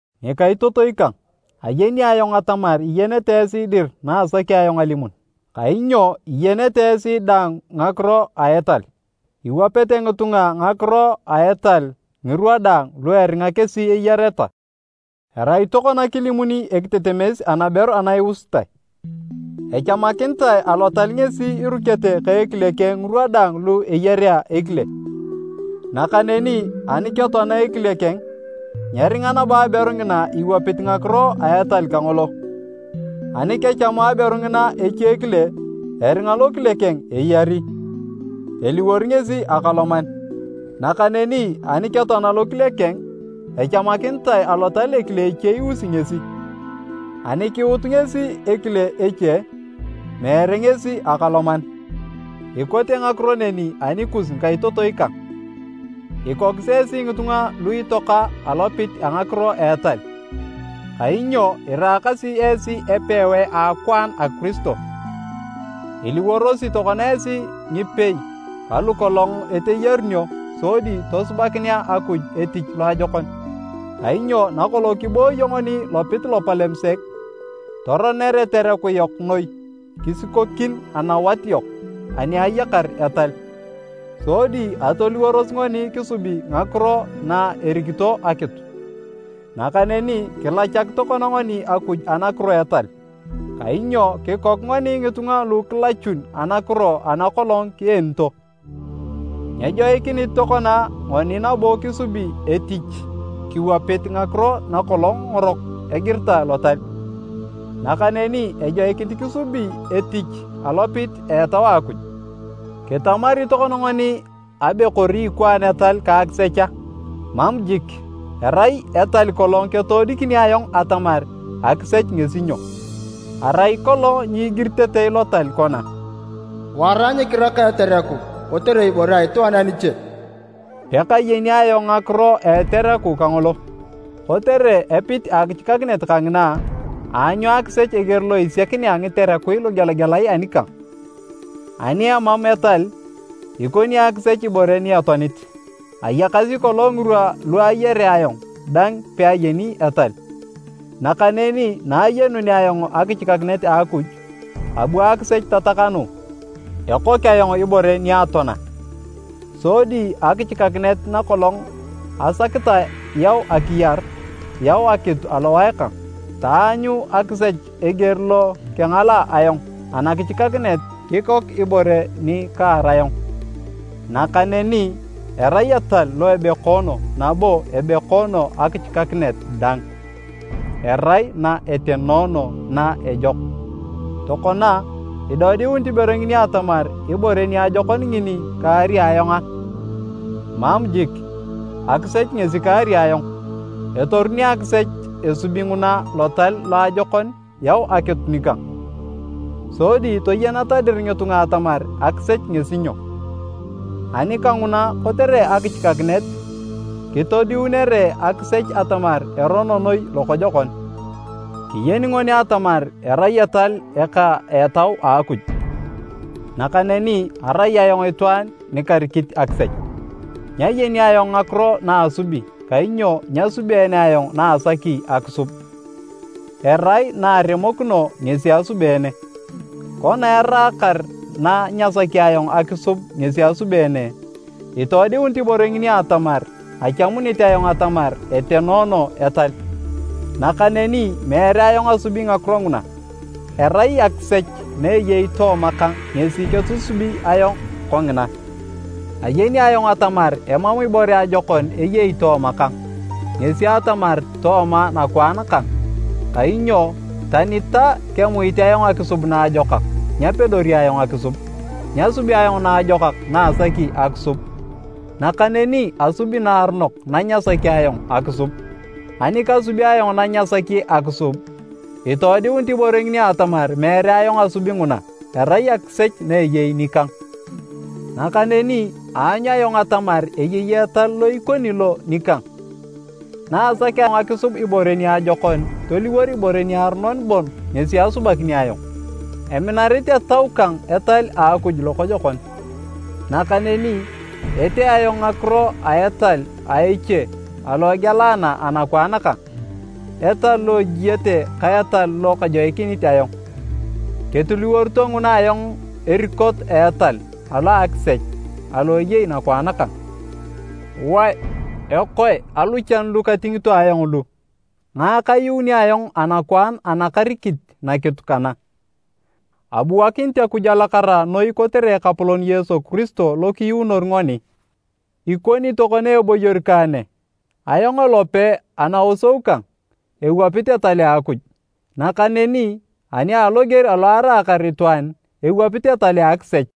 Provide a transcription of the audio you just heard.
Ngikaitotoi kang, ayeni ayong atamar iyenete esi dir na asaki ayong alimun, kainyo iyenete esi daang ngakiro a etal. Iwapete ngitunga ngakiro a etal ngirwa daang lu eringa kesi eyareta. Erai tokona kilimuni ekitetemes anaberu ana iusitae, echamakinitae Alotal ngesi irukete ka ekile keng ngirwa daang lu eyarea ekile, nakaneni ani ketoana ekile keng, nyeringa nabo aberu ngina iwapit ngakiro a etal kangolo. Ani kechamu aberu ngina echekile eringa lokile keng eyari, eliwor ngesi akaloman. Nakaneni ani ketoana lokile keng, echamakinitae Alotal ekile eche iusi ngesi. Ani kuut ngesi ekile eche, meere ngesi akaloman. Ikote ngakiro neni anikus ngikaitotoi kang. Ikokis esi ngitunga lu itoaka alopit a ngakiro a etal kainyo iraakasi esi epewae a akwaan a Kiristo. Iliworosi tokona esi ngipei ka lokolong eteyarunio sodi tosubakinea Akuj etich loajokon. Kainyo nakolong kibooyo ngoni lopit lopalem sek, toroner etereku yok noi kisikokin anawat yok ani ayakar etal, sodi atoliworos ngoni kisubi ngakiro na erikito akitu. Nakaneni kilachak tokona ngoni Akuj anakiro a etal, kainyo kikok ngoni ngitunga lu kilachun anakiro ana kolong kienito. Nyejoikinit tokona ngoni nabo kisubi etich kiwapit ngakiro nakolong ngorok egiritae Lotal, nakaneni ejoikinit kisubi etich alopit a Etau a Akuj. Kitamari tokona ngoni abe kori ikwaan etal ka akisech a? Mam jik! Erai etal kolong ketoodikini ayong atamar akisech ngesi nyo. Arai kolong nyigiritetei Lotal kona, “Wara nyikiraka etereku kotere ibore a itwaan aniche,” pekayeni ayong ngakiro a etereku kangolo. Kotere epit a akichikakinet kangina, aanyu akisech eger lo isiakinea ngiterekui lugelagelae anikang. Ani emam etal, ikoni akisech ibore ni etoanit. Ayakasi kolong ngirwa lu ayarea ayong dang peayeni etal. Nakaneni na ayenunea ayong akichikakinet a Akuj, abu akisech tatakanu, ekok ayong ibore ni atoana. Sodi akichikakinet na kolong asakitae yau akiyar, yau akitu alowae kang. Taanyu akisech eger lo kengalaa ayong anakichikakinet kikok ibore ni kaar ayong. Nakaneni erai etal lo ebekoono nabo ebekoono akichikakinet dang, erai na etenoono na ejok. Tokona, idodiunit ibore ngini atamar ibore niajokon ngini kaari ayong a? Mam jik! Akisech ngesi kaari ayong. Etoruni akisech esubi nguna lotal loajokon yau akitu nikang, sodi toyeneta dir ngitunga atamar akisech ngesi nyo. Ani kanguna kotere akichikakinet, kitoodiunere akisech atamar erono noi lokojokon. Kiyeni ngoni atamar erai etal eka a Etau a Akuj, nakaneni arai ayong itwaan nikarikit akisech. Nyayeni ayong ngakiro naasubi kainyo nyasubeene ayong na asaki akisub, erai na aremokino ngesi asubeene. Kona eraakar na nyasaki ayong akisub ngesi asubeene, itoodiunit ibore ngini atamar achamunit ayong atamar etenoono etal. Nakaneni meere ayong asubi ngakiro nguna, erai akisech na eyei tooma kang ngesi ketusubi ayong kongina. Ayeni ayong atamar emam ibore ajokon eyei tooma kang, ngesi atamar, tooma nakwaan kang, kainyo, tani ta kemuit ayong akisub naajokak, nyapedori ayong akisub. Nyasubi ayong naajokak na asaki akisub, nakaneni asubi naaronok na nyasaki ayong akisub. Ani kasubi ayong na nyasaki akisub, itoodiunit ibore ngini atamar meere ayong asubi nguna, erai akisech na eyei nikang. Nakaneni aanyu ayong atamar eyei etal lo ikoni lo nikang, naasakea ayong akisub ibore niajokon, toliwor ibore niaronon bon ngesi asubakini ayong. Eminarit etau kang etal a Akuj lokojokon. Nakaneni, etee ayong ngakiro a etal a eche alo egealana anakwaan kang, etal lo ejiete ka etal lo kajoikinit ayong. Ketiliworito nguna ayong erikot a etal alo a akisech alo eyei nakwaan kang. Wae! Ekoe aluchan lu katingito ayong lu? Ngae kayuuni ayong anakwaan ana karikit nakitu kana? Abuakinit Akuj alakara noi kotere Ekapolon Yesu Kiristo lo kiyuunor ngoni! Ikoni tokona eboyor kang ne, ayong elope anaosou kang, ewapit etal a Akuj, nakaneni ani aloger alo araakar itwaan, ewapit etal a akisech.